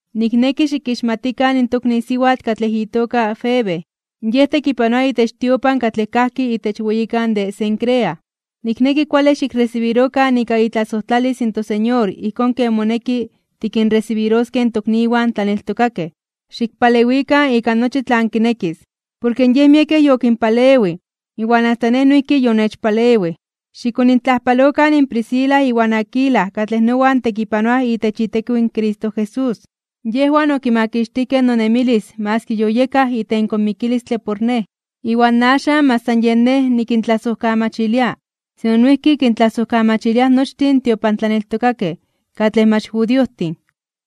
Nikneki xikixmatikan in tokni siwatl katlej itoka Febe. Yej tekipanoa itech tiopan katlej kajki itech weyikan de Cencrea. Nikneki kuale xikresibirokan ika itlasojtlalis in toSeñor ijkón ken moneki tikinresibiroskej in tokniwan tlaneltokakej. Xikpalewikan ika nochi tlan kinekis, porke yej miekej yokinpalewij iwan asta nej noijki yonechpalewij. Xikonintlajpalokan Priscila iwan Aquila katlej nowan tekipanoaj itech itekiw in Cristo Jesús. Yejwan okimakixtijkej nonemilis maski yoyekaj itenko mikilistle por nej. Iwan axan mach san yen nej nikintlasojkamachilia, sino noijki kintlasojkamachiliaj nochtin in tiopantlaneltokakej katlej mach judiojtin.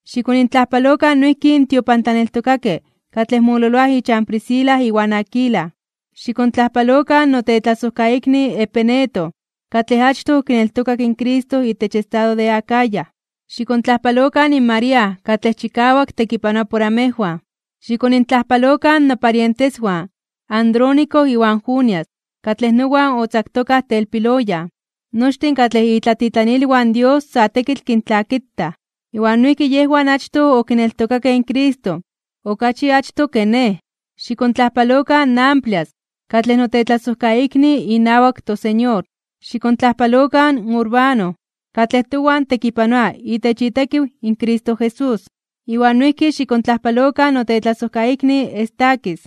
Xikonintlajpalokan noijki in tiopantlaneltokakej katlej mololoaj ichan Priscila iwan Aquila. Xikontlajpalokan notetlasojkaikni Epeneto, katlej achtoj okineltokak in Cristo itech estado de Acaya. Xikontlajpalokan in María, katlej chikawak tekipanoa por amejwan. Xikonintlajpalokan noparienteswan Andrónico iwan Junias, katlej nowan otzaktokaj telpiloyan. Nochtin katlej itlatitlanilwan Dios sa tekitl kintlakitaj. Iwan noijki yejwan achtoj okineltokakej in Cristo, okachi achtoj ke nej. Xikontlajpalokan in Amplias, katlej notetlasojkaikni inawak toSeñor. Xikontlajpalokan in Urbano, katlej towan tekipanoa itech itekiw in Cristo Jesús. Iwan noijki xikontlajpalokan notetlasojkaikni Estaquis.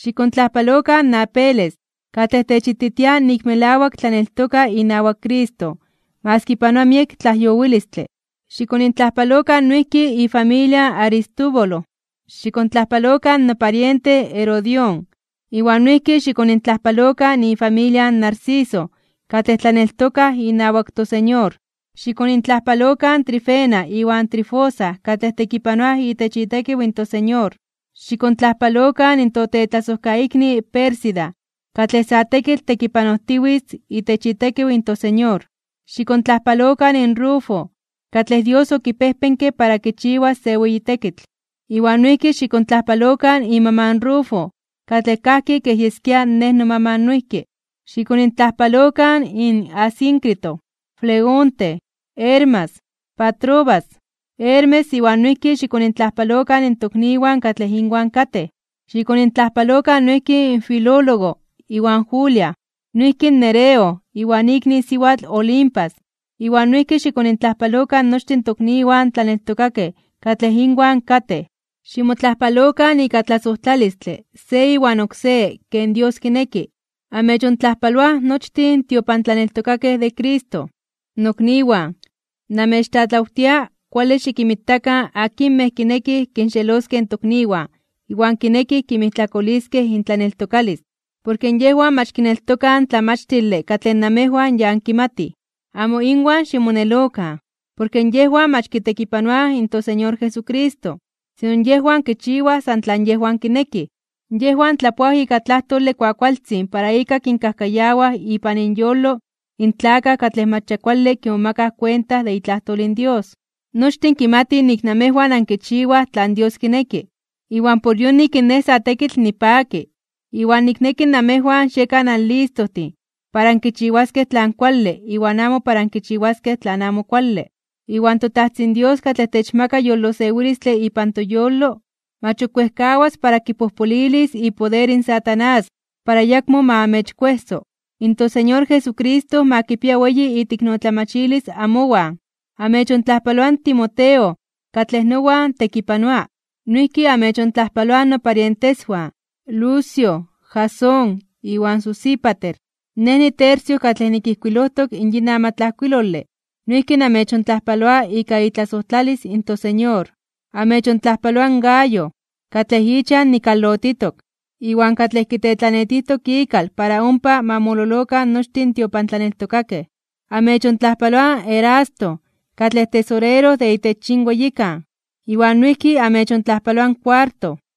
Xikontlajpalokan in Apeles, katlej techititia nik melawak tlaneltoka inawak Cristo maski panoa miek tlajyowilistle. Xikonintlajpalokan noijki ifamilia in Aristóbulo. Xikontlajpalokan nopariente Herodión, iwan noijki xikonintlajpalokan ifamilia in Narciso katlej tlaneltokaj inawak toSeñor. Xikonintlajpalokan in Trifena iwan Trifosa katlej tekipanoaj itech itekiw in toSeñor. Xikontlajpalokan in totetlasojkaikni Pérsida, katlej sa tekitl tekipanojtiwitz itech itekiw in toSeñor. Xikontlajpalokan in Rufo, katlej Dios okipejpenke para kichiwas se weyi tekitl. Iwan noijki xikontlajpalokan imaman in Rufo katlej kajki kej yeskia nej nomaman noijki. Xikonintlajpalokan in Asíncrito, Flegonte, Hermas, Patrobas, Hermes iwan noijki xikonintlajpalokan in tokniwan katlej inwan katej. Xikonintlajpalokan noijki in Filólogo iwan Julia, noijki in Nereo iwan ikni siwatl Olimpas, iwan noijki xikonintlajpalokan nochtin tokniwan tlaneltokakej katlej inwan katej. Ximotlajpalokan ika tlasojtlalistle se iwan oksé ken Dios kineki. Amechontlajpaloaj nochtin in tiopantlaneltokakej de Cristo. Nokniwan, namechtlatlawtia kuale xikinmitakan akinmej kinekij kinxeloskej in tokniwan iwan kinekij kinmijtlakoliskej intlaneltokalis, porke yejwan mach kineltokaj in tlamachtile katlej namejwan ya ankimatij. Amo inwan ximonelokan porke yejwan mach kitekipanoaj in toSeñor Jesucristo, sino yejwan kichiwaj san tlan yejwan kineki. Yejwan tlapoaj ika tlajtole kuakualtzin para ika kinkajkayawaj ipan inyolo in tlakaj katlej mach ya kuale kimomakaj kuenta de itlajtol in Dios. Nochtin kimatij nik namejwan ankichiwaj tlan Dios kineki, iwan por yonik nej sa tekitl nipaki. Iwan nikneki namejwan xiekan anlistojtin para ankichiwaskej tlan kuale iwan amo para ankichiwaskej tlan amo kuale. Iwan toTajtzin Dios katlej techmaka yolosewilistle ipan toyolo, mach ok wejkawas para kipojpolilis ipoder in Satanás para ayakmo ma amechkuejso. In toSeñor Jesucristo ma kipia weyi iteiknotlamachilis amowan. Amechontlajpaloa in Timoteo, katlej nowan tekipanoa. Noijki amechontlajpaloaj noparienteswan Lucio, Jasón iwan Sosípater. Nej, niTercio, katlej nikijkuilojtok in yin amatlajkuilole, noijki namechontlajpaloa ika itlasojtlalis in toSeñor. Amechontlajpaloa in Gayo, katlej ichan nikalotitok, iwan katlej kitetlanetijtok ikal para ompa ma mololokan nochtin in tiopantlaneltokakej. Amechontlajpaloa in Erasto, katlej tesorero de itech yin weyikan, iwan noijki amechontlajpaloa in Cuarto.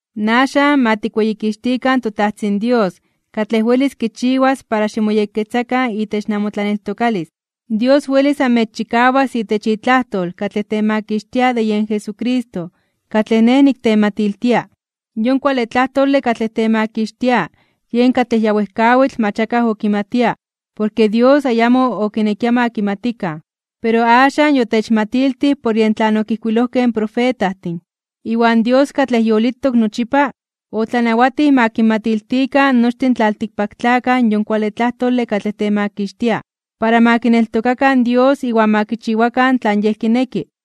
Axan, ma tikweyikixtikan toTajtzin Dios katlej welis kichiwas para ximoyekketzakan itech namotlaneltokalis. Dios welis amechchikawas itech itlajtol katlej temakixtia de yen Jesucristo katlej nej niktematiltia. Yon kuale tlajtole katlej temakixtia yen katlej ya wejkawitl mach akaj okimatia porke Dios ayamo okinekia ma kimatikan. Pero axan yotechmatiltij por yen tlan okijkuilojkej in profetajtin. Iwan Dios katlej yolitok nochipa, otlanawatij ma kinmatiltikan nochtin tlaltikpaktlakaj yon kuale tlajtole katlej temakixtia, para ma kineltokakan Dios iwan ma kichiwakan tlan Yej kineki.